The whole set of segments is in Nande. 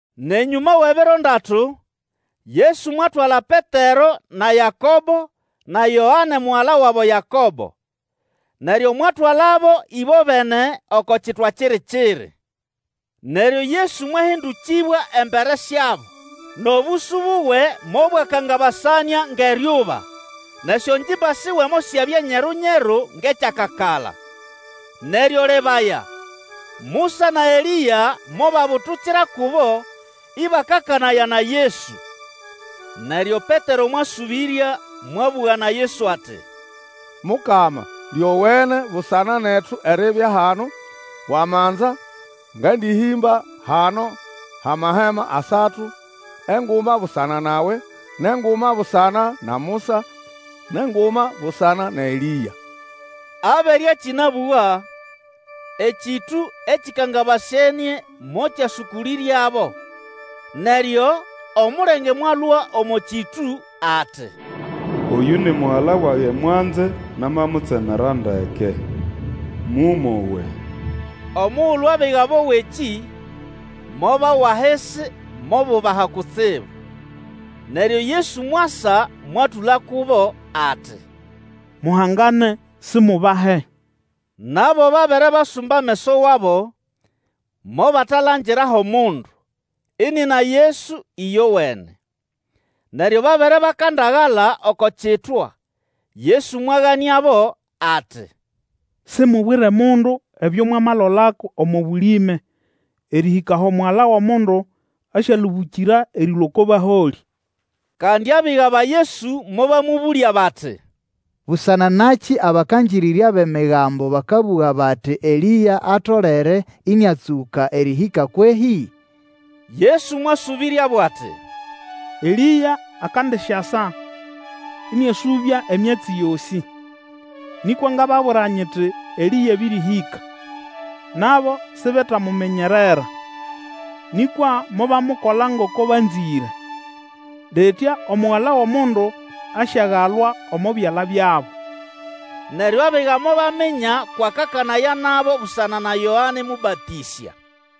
Nʼenyũma wʼebiro ndatu, Yesu mwatwala Petero na Yakobo, na Yoane mugala wabo Yakobo. Neryo mwatwalabo ĩbobene oko kitwa kiri-kiri. Neryo Yesu mwahĩndũkĩbwa embere syabo, nʼobũsũ buwe mobwakangabasanĩa ngʼeryuba, nʼesyongimba siwe mosyabya nyeru-nyeru ngʼekyakakala. Neryo lebaya, Musa na Elĩa mobabutukira kubo ĩbakakanaya na Yesu. Neryo Petero mwasũbĩrya mwabũga na Yesu ati, Mukama, lyowene busana netu eribya hano; wamanza, ngandĩhĩmba hano hʼamahema asatu, enguma busana nawe, nʼenguma busana na Musa, nʼenguma busana na Elĩa. Abere akĩnabũga, ekĩtũ ekĩkangabasenĩe mokyasũkũlĩryabo; neryo, omulenge mwalũa omo kĩtũ ati, Oyũ ni Mugala wage mwanze, namamutsemera ndeke; mũmwowe! Omugulu abiga bowa ekĩ, mobawa ahisi mobubaha kutsibu. Neryo Yesu mwasa mwatũla kubo ati, Muhangane, simubahe. Nabo babere basumba ameso wabo, mobatalangira ho mundu, inina Yesu ĩyowene. Neryo babere bakandagala oko kitwa, Yesu mwaganĩabo ati, Simubwire mundu ebyo mwamalolako omo bũlĩme, erĩhĩka aho Omugala wʼomundu asyalũbũkĩra erĩlũa oko baholĩ. Kandi abiga ba Yesu mobamũbũlya bati, Busana nakĩ abakangĩrĩrya bʼEmigambo bakabũga bati Elĩa atolere ĩnĩatsũka erĩhĩka, kwehĩ? Yesu mwasũbĩryabo ati, Elĩa akandisyasa, ĩnĩasũbya emyatsi yosĩ. Nĩkwa ngababwira nyiti, Elĩa abĩrĩhĩka, nabo sibetamuminyerera, nĩkwa mobamukola ngoko banzĩre. Litya Omugala wʼomundu asyagalwa omo byala byabo. Neryo abiga mobaminya kwʼakanaya nabo busana na Yoane Mũbatĩsya.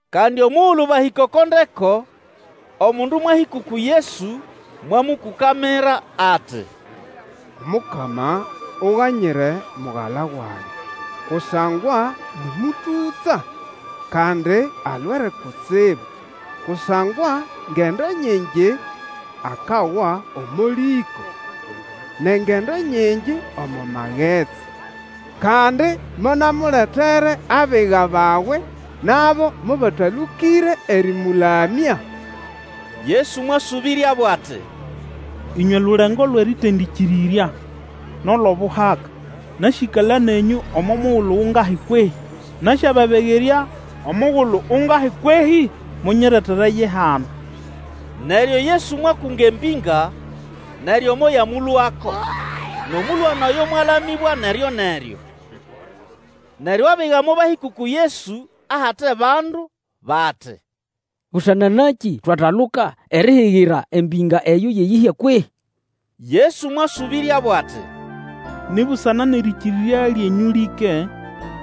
Kandi omugulu bahĩka oko ndeko, omundu mwahĩka uku Yesu, mwamũkũkamira ati, Omukama, Uganyire mugala wage; kusangwa nĩ mũtũtsa, kandi alwere kutsibu; kusangwa ngendo nyingi akawa omo lĩko, nʼengendo nyingi omo magetsi. Kandi monamuletere abiga bawe, nabo mobatalũkĩre erĩmũlamya. Yesu mwasũbĩryabo ati, ĩnywe lulengo lwʼerĩtendĩkirĩrya nʼolʼobuhaka! Nasĩkala nenyũ omo mugulu ungahi kwehĩ? Nasyababegerya omugulu ungahi kwehĩ? Munyiretere ye hano. Neryo Yesu mwakunga embĩnga, neryo moyamũlũako, nʼomũlwana oyo mwalamĩbwa neryoneryo. Neryo abiga mobahĩka uku Yesu ahate bandu bati, Busana nakĩ twataluka erihigira embĩnga eyo yʼeyĩhya kwehĩ? Yesu mwasũbĩryabo ati, Ni busana nʼerĩkĩrĩrya lyenyũ lĩke.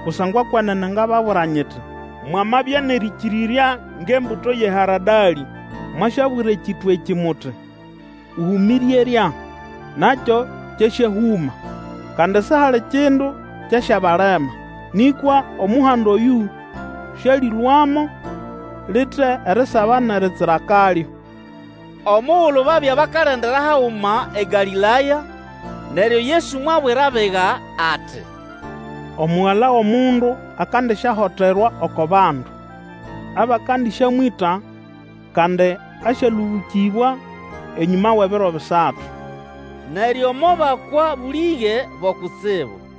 Kusangwa kwenene ngababwira nyiti, Mwamabya nʼerĩkĩrĩrya ngʼembuto yʼeharadalĩ, mwasyabwira ekitwa ekĩ muti, ũhũmĩre erya, nakyo kyasyahũma; kandi sihali kindu kyasyabalema. [ Nĩkwa omuhanda oyũ sialĩlũamo lite erisaba nʼeritsira kalyo.] Omugulu babya bakalendera haguma eGalĩlaya, neryo Yesu mwabwira abiga ati, Omugala wʼomundu akandisyahoterwa oko bandu, abakandĩsyamwĩta, kandi asyalũbũkĩbwa enyũma wʼebiro bisatu. Neryo mobakwa bũlĩge bo kutsibu.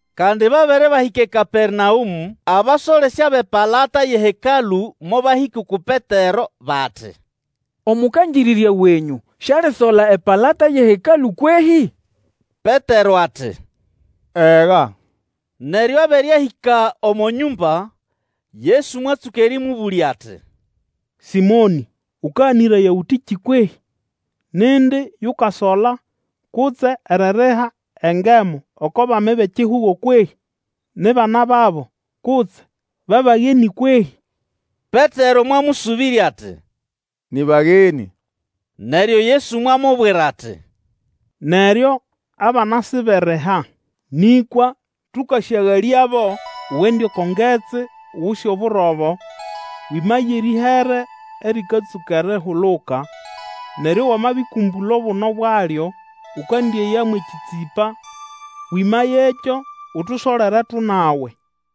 Kandi babere bahĩka eKapernaũmũ, abasolesya bʼepalata yʼeHekalũ mobahĩka uku Petero, bati, Omũkangĩrĩrya wenyũ sialisola epalata yʼeHekalũ kwehĩ? Petero ati, Ega. Neryo abere ahĩka omo nyũmba, Yesu mwatsũka erĩmũbũlya ati, Sĩmonĩ, Ũkaganĩraya ũtĩkĩ kwehĩ? Nindi yukasola kutse eririha engemu oko bami bʼekihugo kwehĩ? Ni bana babo, kutse ba bagenĩ kwehĩ? Petero mwamũsũbĩrya ati, Nĩ bagenĩ. Neryo Yesu mwamubwira ati, Neryo abana siberiha. Nĩkwa tũkasyagalyabo, ugende oko ngetsi, Uguse oburobo, wĩmaye erĩhere erĩkatsũka erihuluka, neryo wamabĩkũmbũla obuno bwalyo, ũkandĩeya mwʼekĩtsĩpa, wĩmayekyo utusolere, tũnawe.